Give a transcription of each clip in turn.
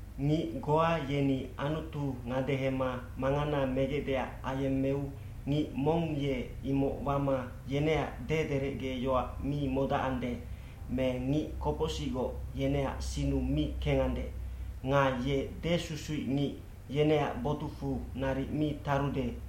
Ngic goa yeni Anutu ngadehema mangana megecdeac ayemmeu ngic mong ye imoc wama yeneac dederecgeyoac mi modacande, me ngic kopocsicgoc yeneac sinnu mi kengande, nga ye desusuicngic, yeneac botucfu naric mi tarude,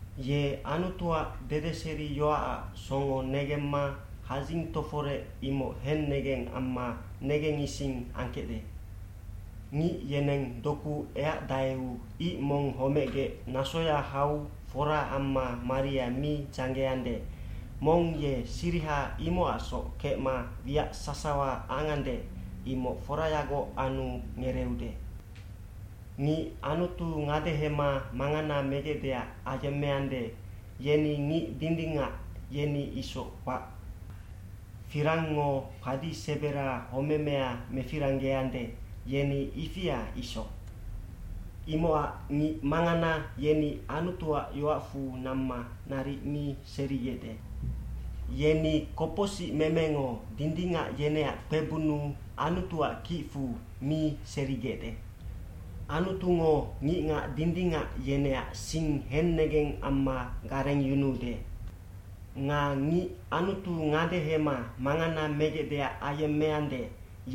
Ye Anutuac dedeseriyoacac songo negemma hadzing toforec imoc hennegeng amma negengising angkecde.b cNgic yeneng doku eacdaeu ic mong homecgec nasoya hau fora amma maria mi dzanggeande, mong ye siriha imocacsoc kecma wiac sasawa angande, imoc forayagoc anu ngereeude. Ngic Anutu ngadehema mangana megecdeac ayemmeande, yeni ngic dindingac, yeni isoc kpac. Firangngo padi sebera homemea mefiranggeande, yeni ifia isoc. Imocac ngic mangana yeni Anutuac yoacfu namma naric mi serigecde. Yeni kopocsicmemengo dindingac yeneac kpebunnu Anutuac kicfu mi serigecde. Anutungo ngicngac dindingac yeneac sing hennegeng amma garengyunuude. Nga ngic Anutu ngadehema mangana megecdeac ayemmeande,